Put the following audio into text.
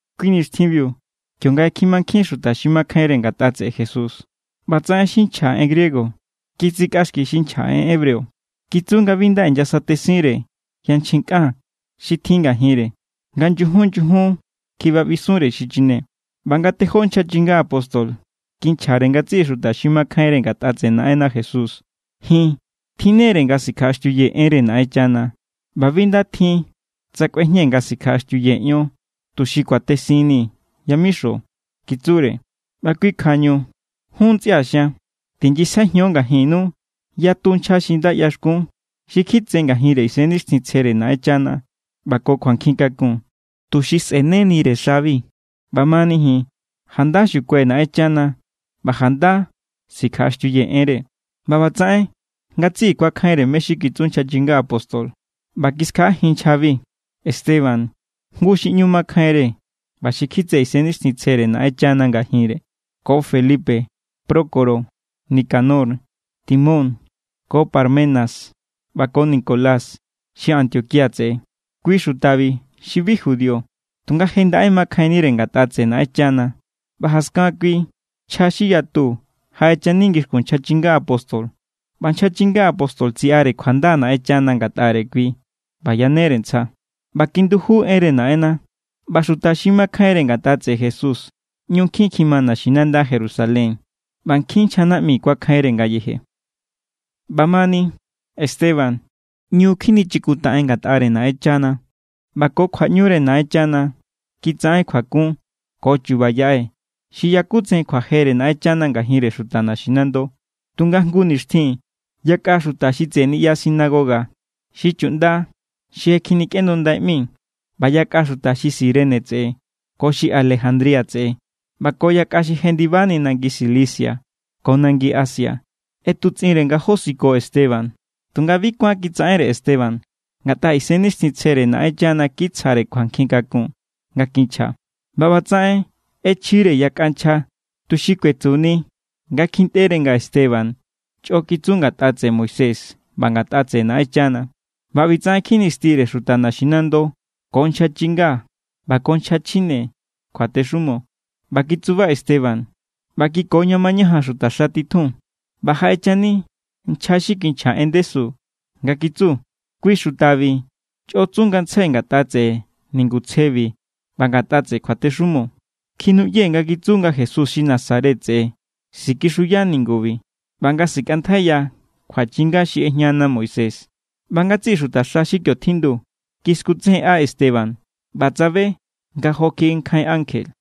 Kui nixtjinbiu kionga je kjimankjín xuta xi makjainre ngatꞌa tseꞌe Jesús, ꞌbatsaꞌen xi nchja en griego kitsikꞌaxki xi nchja en hebreo. Kitsu nga bi nda inyasatesinre yanchjin kꞌan xi tjin ngajinre nga nyujun nyujun kjiꞌbaꞌbisunre xi chine. ꞌBa nga tejó nchja chinga apóstol kinchjare ngatsiꞌi xuta xi makjainre ngatꞌa tseꞌe Naꞌenna Jesús. —Ji̱n tjinnere nga sikjaꞌaxtiuyee̱ enre Naꞌenchana. ꞌBa bi nda tjin tsa kꞌuejñee̱ nga sikjaꞌaxtiuyee̱ ion tuxi kuatesinnii̱ yamixo —kitsure—. ꞌBa kui kjuañu jun, ntsꞌia̱ xian, tinyisjaijiun ngajinnu yatu nchja xi nda ꞌyaxkun, xi kjitse ngajinre Isennixtjintsjere Naꞌenchana ꞌba ko kjuankjin kakun, tuxi sꞌe̱nenire xabi. ꞌBamani ji̱n, janda xukuai̱ Naꞌenchana ꞌba janda sikjaꞌaxtiuyee̱ enre. ꞌBa ꞌbatsaꞌen ngatsiꞌi kuakjainre mé= xi kitsu nchja chinga apóstol ꞌba kiskjaꞌajin nchjabi: Esteban, jngu xi ꞌñu makjainre ꞌba xi kjitse Isennixtjintsjere Naꞌenchana ngajinre, ko Felipe, Prócoro, Nicanor, Timón, ko Parmenas ꞌba ko Nicolás xi Antioquía tseꞌe. Kui xutabi xi bi judío, tunga je ndaꞌe makjainnire ngatꞌa tseꞌe Naꞌenchana. ꞌBa jaskan kui nchja xi yatu jaꞌechani ngixkun nchja chinga apóstol, ꞌba nchja chinga apóstol tsiꞌare kjuanda Naꞌenchana ngatꞌare kui ꞌba yanere ntsja. ꞌBa kinduju enre Naꞌenna, ꞌba xuta xi makjainre ngatꞌa tseꞌe Jesús ꞌñu nkjin kjima naxinanda Jerusalén, ꞌba nkjin nchja naꞌmi kuakjainre ngayeje. ꞌBa mani Esteban, ꞌñu kjinichikuntaꞌen ngatꞌare Naꞌenchana. ꞌBa ko kjuaꞌñure Naꞌenchana kitsaꞌen kjuakun ko chu̱ba̱ yaꞌe xi yakutsejen kjuajere Naꞌenchana ngajinre xuta naxinando. Tunga jngu nixtjin yakꞌa xuta xi tseꞌe niꞌya sinagoga xi Chuꞌnda xi Je Kjinikꞌendundai ꞌmi, ꞌba yakꞌa xuta xi Cirene tseꞌe, ko xi Alejandría tseꞌe, ꞌba ko yakꞌa xi jendibani nangi Cilicia ko nangi Asia ꞌetutsꞌinre nga josiko Esteban. Tunga bi kuán kitsaꞌenre Esteban, ngatꞌa Isennixtjintsjere Naꞌenchana kitsjare kjuankjin kakun nga kinchja. ꞌBa ꞌbatsaꞌen ꞌechjire yakꞌa nchja, tuxi kuetsuni nga kjintꞌere nga Esteban chꞌo kitsu ngatꞌa tseꞌe Moisés ꞌba ngatꞌa tseꞌe Naꞌenchana. ꞌBa ꞌbitsaꞌen kjinistire xuta naxinando ko nchja chinga ꞌba ko nchja chjine kjuatexumo. ꞌBa kitsuba Esteban ꞌba kiko ña mañajan xutaxa titjun. ꞌBa jaꞌechani nchja xi kinchja en ndesu nga kitsu: —Kui xutabi chꞌo tsu ngantsjai ngatꞌa tseꞌe ningutsjebi ꞌba ngatꞌa tseꞌe kjuatexumo. Kjinuꞌyee̱ nga kitsu nga Jesús xi Nazaret tseꞌe sikixuya ningubi ꞌba nga sikꞌantjaiya kjuachinga xi ꞌejñana Moisés. ꞌBa ngatsiꞌi xutaxa xi kio tjindu kiskutsejenꞌa Esteban ꞌba tsabe nga jo kjiꞌi nkjain ankje.